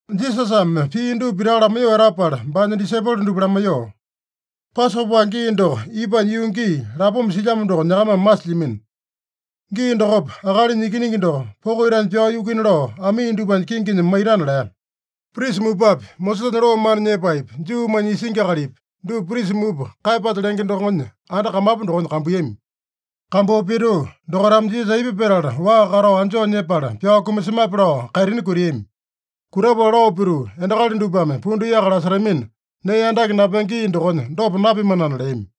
Jisasame pii dupa pitaka lamaiyoo etapala, baanya disaipolo dupa lamaiyoo, “Pasopa gii doko ipanya yuu gii lapoma silyamo doko nyakamame masilyamino. Gii dokopa Akalinya Ikiningi doko poko itanya pyao yukuina lao amii dupanya kinginya maitana” lea. Prisa mupapi, Mosesanya loo mana nyepaepi, Juumanya isingi akalipi, dupa prisa mupa Kaeyapasa lenge dokonya anda kamapu dokonya kambuiyami. Kambuu pituu, dokaitame Jisasa aipa petala waa katao anjoo nyepala pyao kumasemape lao kaitini kutiami. Kutapala lao pituu, “Endakali dupame pundu yaka lasetamina, nee andake napenge gii dokonya dopa napimanana” leami.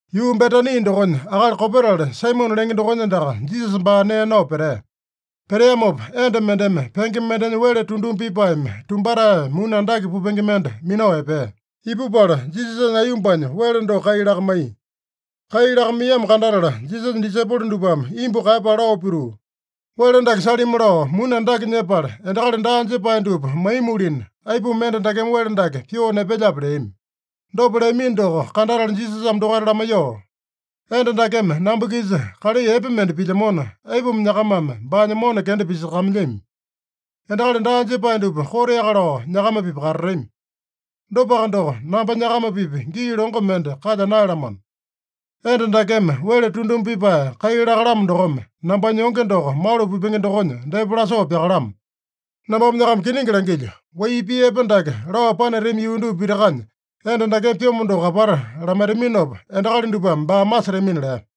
Yuu Betani dokonya akali kopetali Saimone lenge dokonya andaka Jisasa baa nee nao petea. Peteamopa enda mendeme penge mendenya wele tunduma pipaeme tumbatae, muni andake pupenge mende minao epea. Ipupala Jisasanya aiyombanya wele doko kai lakamaiya. Kai lakamaiyamo kandatala, Jisasanya disaipolo dupame imbu kaeyapala lao pituu, “Wele dake salimi lao muni andake nyepala, endakali daa jepae dupa maimualina, aipuma enda dakeme wele dake pyoo nepelyape?” leami. Dopa leamino doko kandatala Jisasame dokaita lamaiyoo, “Enda dakeme namba-kisa kalai epe mende pilyamona, aipuma nyakamame baanya mona kenda pisakamailyami? Endakali daa jepae dupa koteaka lao nyakama-pipa katatami. Dopaka doko, namba nyakama-pipa gii longo mende kalya naeyalamano. Enda dakeme wele tunduma pipae kai lakalamo dokome, nambanya yonge doko malu pipenge dokonya depa lasoo pyakalamo. Nambame nyakama kiningi langilyo: Wai pii epe dake lao panatami yuu dupa pitakanya, enda dakeme pyomo doko apata lamaitaminopa, endakali dupame baa masetamina” lea.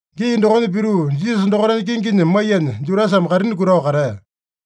Gii dokonya pituu, Jisasa dokaitanya kinginya maiyanya Judasame kaitini kutao katea.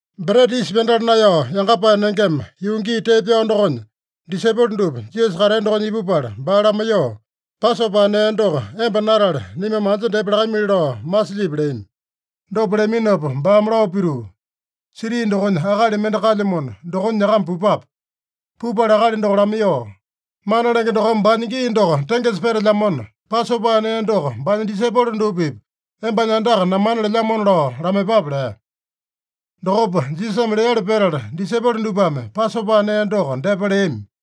Breta Yisa Pyandala Naeyao Yangapae Nengema, yuu gii tee pyao dokonya, disaipolo dupa Jisasa katea dokonya ipupala baa lamaiyoo, “Pasopa nee doko emba natale, naimame anja depa lakamili lao masilyipi?” leami. Dopa leaminopa baame lao pituu, “Siti dokonya akali mende kalyamona, dokonya nyakama pupape. Pupala akali doko lamaiyoo, ‘Mana Lenge dokome baanya gii doko tengesa petelyamona, Pasopa nee doko baanya disaipolo dupa-pipa embanya andaka namana lelyamona’ lao lamaiyepape” lea. Dokopa Jisasame leali petala, disaipolo dupame Pasopa nee doko depa leami.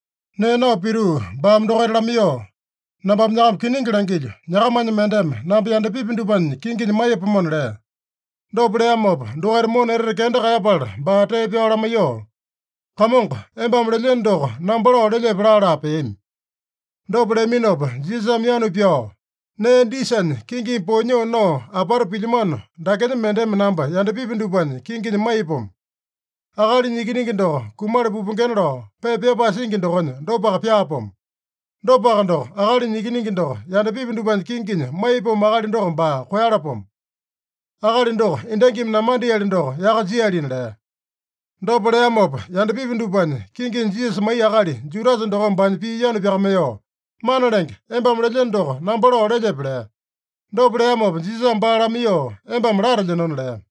Nee nao pituu baame dokaita lamaiyoo, “Nambame nyakama kiningi langilyo: Nyakamanya mendeme namba yandapipi dupanya kinginya maiyapomona” lea. Dopa leamopa, dokaita mona etete kenda kaeyapala baa tee pyao lamaiyoo, “Kamongo, embame lelyeno doko namba lao lelyepe?” laa-laa peami. Dopa leaminopa Jisasame yanu pyao, “Nee disanya kingimi poeyanyoo nao apata pilyamano dakenya mendeme namba yandapipi dupanya kinginya maiyapomo. Akalinya Ikiningi doko kumala pupengena lao pepa pyapae singi dokonya, dopaka pyaapomo. Dopaka doko, Akalinya Ikiningi doko yandapipi dupanya kinginya maiyapomo akali doko baa koeyalapomo! Akali doko endangimi namandeali doko yaka jialina” lea. Dopa leamopa, yandapipi dupanya kinginya Jisasa maiya akali Judasa dokome baanya pii yanu pyakamaiyoo, “Mana Lenge, embame lelyeno doko namba lao lelyepe?” lea. Dopa leamopa Jisasame baa lamaiyoo, “Embame latelyenona” lea.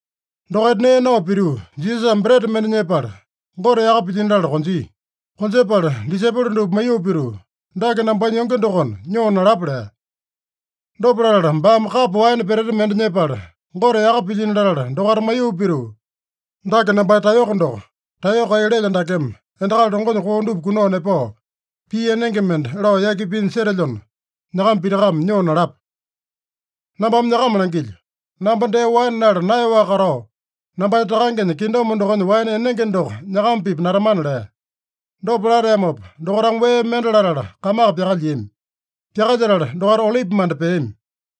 Dokaita nee nao pituu, Jisasame breta mende nyepala, Gote yaka pilyino latala konjia. Konjepala disaipolo dupa maiyoo pituu, “Dake nambanya yonge dokona, nyoo nalapa” lea. Dopa latala baame kapo waene peteta mende nyepala, Gote yaka pilyino latala, dokaita maiyoo pituu, “Dake nambanya taeyoko doko. Taeyoko kai lelyo dakeme endakali longonya koo dupa kunao nepao, pii enenge mende lao yaki pinya setelyona, nyakama pitakame nyoo nalapa. Nambame nyakama langilyo: Namba dee waene nala naeyaowaka katao, nambanya Takangenya kingdom dokonya waene enenge doko nyakama-pipa natamana” lea. Dopa lateamopa, dokaitame wee mende latala kamaka pyakalyiami. Pyakalyetala dokaita Olipimanda peami.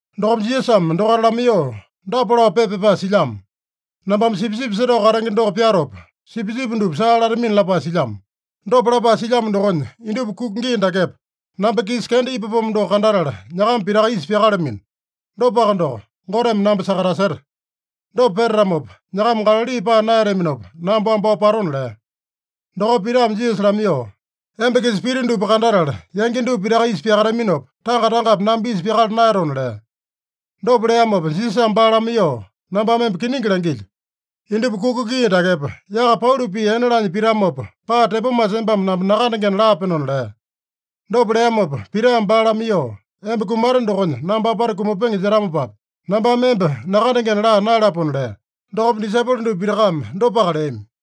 Dokopa Jisasame dokaita lamaiyoo, “Dapa lao pepa pyapae silyamo: ‘Nambame sipisipi setao katenge doko pyatopa, sipisipi dupa saa latamina’ lapae silyamo. Dopa lapae silyamo dokonya, indupa kuka gii dakepa, namba-kisa kenda ipapomo doko kandatala, nyakama pitaka isa pyakalamino. Dopaka doko, Goteme namba sakataseta. Dopa petatamopa, nyakama Galali paa naeyataminopa, namba wambao patona” lea. Dokopa Pitame Jisasa lamaiyoo, “Emba-kisa pita dupa kandatala yangi dupa pitaka isa pyakataminopa, tanga-tangapi namba isa pyakala naeyatona” lea. Dopa leamopa Jisasame baa lamaiyoo, “Nambame emba kiningi langilyo: Indupa kuka gii dakepa, yaka pauli pii ene laanya pitamopa, paa tepomasa embame namba nakandengena laapenona” lea. Dopa leamopa Pitame baa lamaiyoo, “Emba kumate dokonya namba apata kumapenge jetamopapi, nambame emba nakandengena laa naeyalapona” lea. Dokopa disaipolo dupa pitakame dopaka leami.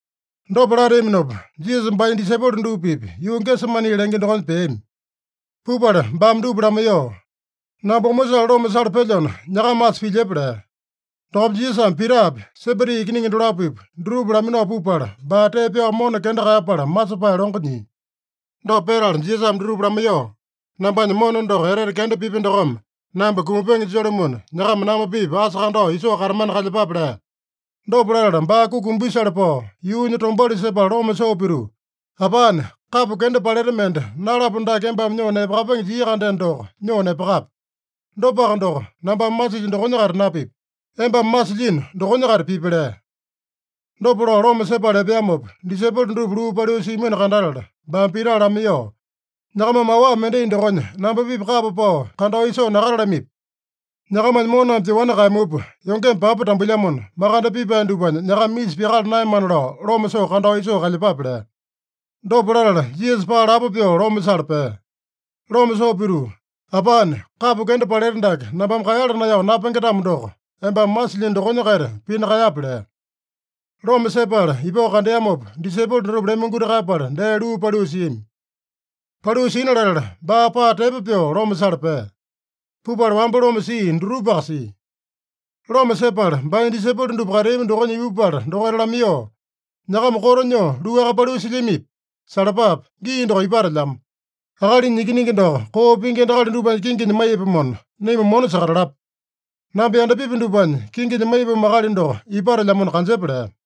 Dopa lateaminopa, Jisasa baanya disaipolo dupa-pipa yuu Gesemani lenge dokonya peami. Pupala baame dupa lamaiyoo, “Namba omosale loma sala pelyona, nyakama asa pilyepa” lea. Dokopa Jisasame Pitapi, Sebedi ikiningi dolapopi, dutupa laminao pupala, baa tee pyao mona kenda kaeyapala masepae longo nyia. Dopa petala Jisasame dutupa lamaiyoo, “Nambanya mona doko etete kenda pipya dokome namba kumapenge julumuna, nyakama namba-pipa asa kandao isoo katamana kalyepape” lea. Dopa latala baa kuki umbisale pao, yuunya tombauli sepala loma soo pituu, “Apane, kapo kenda paleta mende nalapo dake embame nyoo nepakapenge jia-kandeno doko, nyoo nepakape. Dopaka doko, nambame masilyo dokonya-kaita napipi. Embame masilyino dokonya-kaita pipi” lea. Dopa lao loma sepala epeamopa, disaipolo dutupa luu paliu siamino kandatala, baame Pita lamaiyoo, “Nyakamame awa mendai dokonya namba-pipa kapa pao kandao isoo nakatalamipi? Nyakamanya moname pyoani kaeyamupa, yongeme papa tambuilyamona, makande pipae dupanya nyakama isa pyakala naeyamana lao loma soo kandao isoo kalyepape” lea. Dopa latala Jisasa paa lapo pyoo loma sala pea. Loma soo pituu, “Apane, kapo kenda paleta dake nambame kaeyala naeyao napenge-tamo doko, embame masilyino dokonya-kaita pina kaeyape” lea. Loma sepala ipao kandeamopa, disaipolo dutupa lemonguti kaeyapala dee luu paliu siami. Paliu sina latala, baa paa tepo pyoo loma sala pea. Pupala wamba loma sia dutupaka sia. Loma sepala, baanya disaipolo dupa kateami dokonya ipupala dokaita lamaiyoo, “Nyakama koto nyoo luaka paliu silyamipi? Salapape! Gii doko ipatelyamo. Akalinya Ikiningi doko koo pingi endakali dupanya kinginya maiyapomona, naima mona sakatalapa. Namba yandapipi dupanya kinginya maiyapomo akali doko ipatelyamona kanjepa” lea.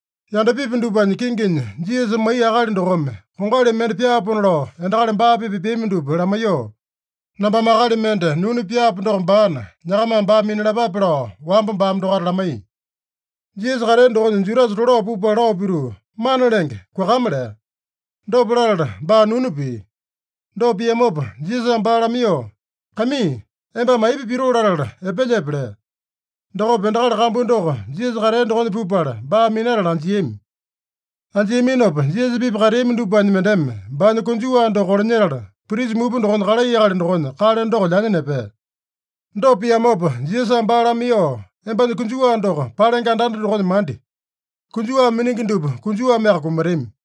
Yandapipi dupanya kinginya Jisasa maiya akali dokome kongali mende pyaapona lao endakali baa-pipa epeami dupa lamaiyoo, “Nambame akali mende nunu pyaapo doko baana, nyakamame baa minalapape” lao wamba baame dokaita lamaiya. Jisasa katea dokonya Judasa tolao pupala lao pituu, “Mana Lenge, kuakama!” lea. Dopa latala baa nunu pia. Dopa piamopa Jisasame baa lamaiyoo, “Kaimii, embame aipa pitoo latala epelyepe?” lea. Dokopa endakali kambu doko Jisasa katea dokonya ipupala, baa minatala anjiami. Anjiaminopa Jisasa-pipa kateami dupanya mendeme baanya konjuwa doko kolanyetala, prisa mupa dokonya kalai akali dokonya kale doko lyanya nepea. Dopa piamopa Jisasame baa lamaiyoo, “Embanya konjuwa doko palenge andanda dokonya mandi. Konjuwa miningi dupa konjuwameaka kumatami.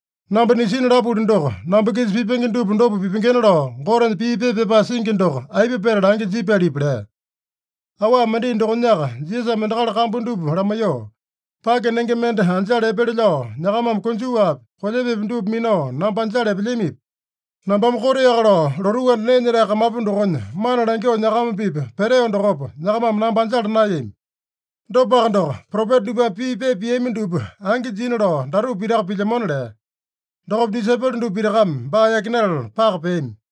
Namba nisina lapuli doko, namba-kisa pipenge dupa dopa pipengena lao Gotenya pii pepa pyapae singi doko aipa petala angi jipyalipi?” lea. Awa mendai dokonyaka Jisasame endakali kambu dupa lamaiyoo, “Pake nenge mende anjala epele lao nyakamame konjuwapi, kolyepepi dupa minao namba anjala epelyamipi? Nambame koteaka lao lotuu anda nee nyetae kamapu dokonya mana langyoo nyakama-pipa peteo dokopa, nyakamame namba anjala naeyami. Dopaka doko, propeta dupame pii pepa piami dupa angi jina lao datupa pitaka pilyamona” lea. Dokopa disaipolo dupa pitakame baa yakinatala paka peami.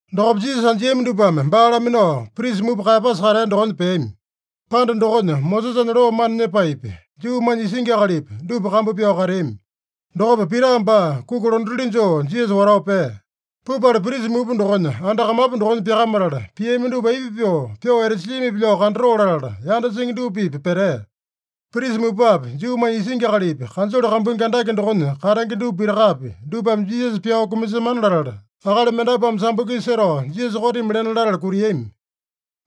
Dokopa Jisasa anjiami dupame baa laminao, prisa mupa Kaeyapasa katea dokonya peami. Panda dokonya Mosesanya loo mana nyepaepi, Juumanya isingi akalipi, dupa kambu pyao kateami. Dokopa Pita baa kuki londatili joo Jisasa watao pea. Pupala prisa mupa dokonya anda kamapu dokonya pyakamatala, piami dupa aipa pyoo, pyoo etasilyamipi lao kandatoo latala, yanda singi dupa-pipa petea. Prisa mupapi, Juumanya isingi akalipi, kanjole kambuingi andake dokonya katenge dupa pitakapi, dupame Jisasa pyao kumasemana latala, akali mendapuame sambo-kisa setao Jisasa kotimi lena latala kutiami.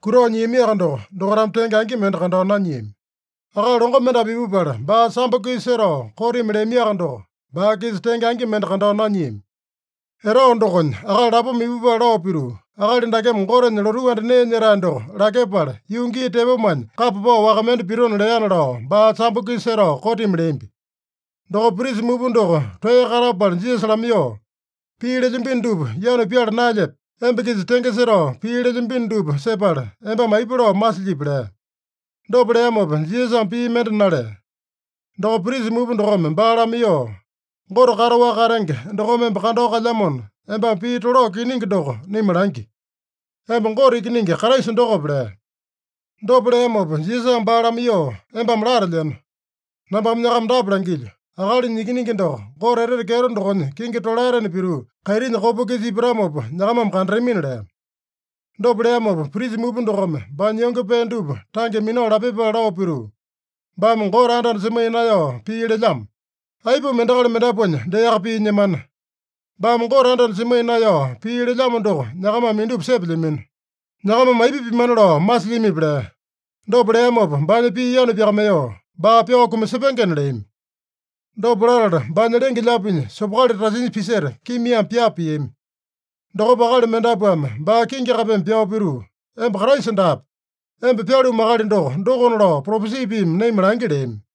Kutao nyiamiaka doko, dokaitame tenge angi mende kandao nanyiami. Akali longo mendapu ipupala, baa sambo-kisa setao kotimi leamiaka doko, baa-kisa tenge angi mende kandao nanyiami. Etao dokonya akali lapoma ipupala lao pituu, “Akali dakeme, ‘Gotenya lotuu anda nee nyetae doko lakyepala, yuu gii tepomanya kapa pao waka mende pitona’ leana” lao, baa sambo-kisa setao kotimi leambi. Dokopa prisa mupa doko toeya katapala Jisasa lamaiyoo, “Pii lelyambino dupa yanu pyala naelyepe? Emba-kisa tenge setao pii lelyambino dupa sepala, embame aipa lao masilyipi?” lea. Dopa leamopa Jisasame pii mende nalea. Dokopa prisa mupa dokome baa lamaiyoo, “Gote kataowaka katenge dokome emba kandao kalyamona, embame pii tolao kiningi doko naima langi: Emba Gote Ikiningi Kraisa dokope?” lea. Dopa leamopa Jisasame baa lamaiyoo, “Embame latelyeno. Nambame nyakama dapa langilyo: Akalinya Ikiningi doko, Gote etete kyeto dokonya kingi tolaetena pituu, kaitinya kopa-kisa ipatamopa nyakamame kandatamina” lea. Dopa leamopa, prisa mupa dokome baanya yonge pee dupa tange minao lapyepala lao pituu, “Baame Gote anda-anda semaiya naeyao pii lelyamo! Aipuma endakali mendapuanya deaka pii nyemana? Baame Gote anda-anda semaiya naeyao pii lelyamo doko nyakamame indupa sepelyamino. Nyakamame aipa pimana lao masilyamipi?” lea. Dopa leamopa baanya pii yanu pyakamaiyoo, “Baa pyao kumasepengena” leami. Dopa latala, baanya lenge-lyaapinya sopokali tasinya piseta, kimiame pyapa piami. Dokopa akali mendapuame baa kingi kapeme pyao pituu, “Emba Kraisa daape! Emba pyalumu akali doko, dokona lao propesi piimi naima langi” leami.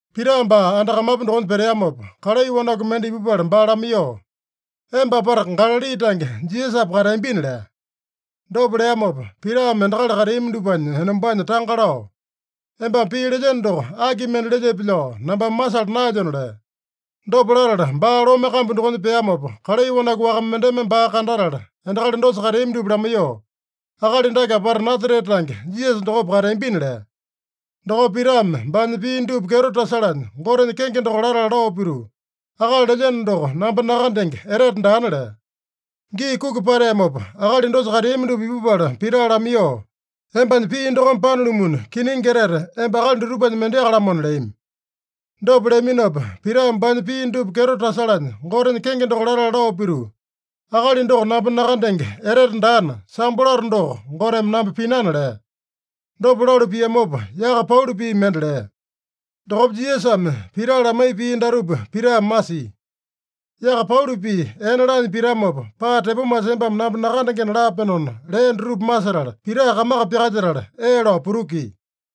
Pita baa anda kamapu dokonya peteamopa, kalai wanaku mende ipupala baa lamaiyoo, “Emba apata Galali tange Jisasapa kateambina” lea. Dopa leamopa, Pitame endakali kateami dupanya enombanya tanga lao, “Embame pii lelyeno doko aki mende lelyepe lao nambame masala naelyona” lea. Dopa latala baa lome kambu dokonya peamopa, kalai wanaku waka mendeme baa kandatala, endakali dosa kateami dupa lamaiyoo, “Akali dake apata Nasarete tange Jisasa dokopa kateambina” lea. Dokopa Pitame baanya pii dupa kyeto tasalanya, Gotenya kenge doko latala lao pituu, “Akali lelyeno doko namba nakandenge etete daana” lea. Gii kuki pateamopa, akali dosa kateami dupa ipupala Pita lamaiyoo, “Embanya pii dokome panalumuna, kiningi etete emba akali dutupanya mendeaka-lamona” leami. Dopa leaminopa Pitame baanya pii dupa kyeto tasalanya Gotenya kenge doko latala lao pituu, “Akali doko namba nakandenge etete daana, sambo lato doko Goteme namba pinana” lea. Dopa lalu piamopa, yaka pauli pii mende lea. Dokopa Jisasame Pita lamaiya pii datupa Pitame masia: “Yaka pauli pii ene laanya pitamopa, paa tepomasa embame namba nakandengena laapenona” lea dutupa masetala, Pita kamaka pyakalyetala, ee lao putukia.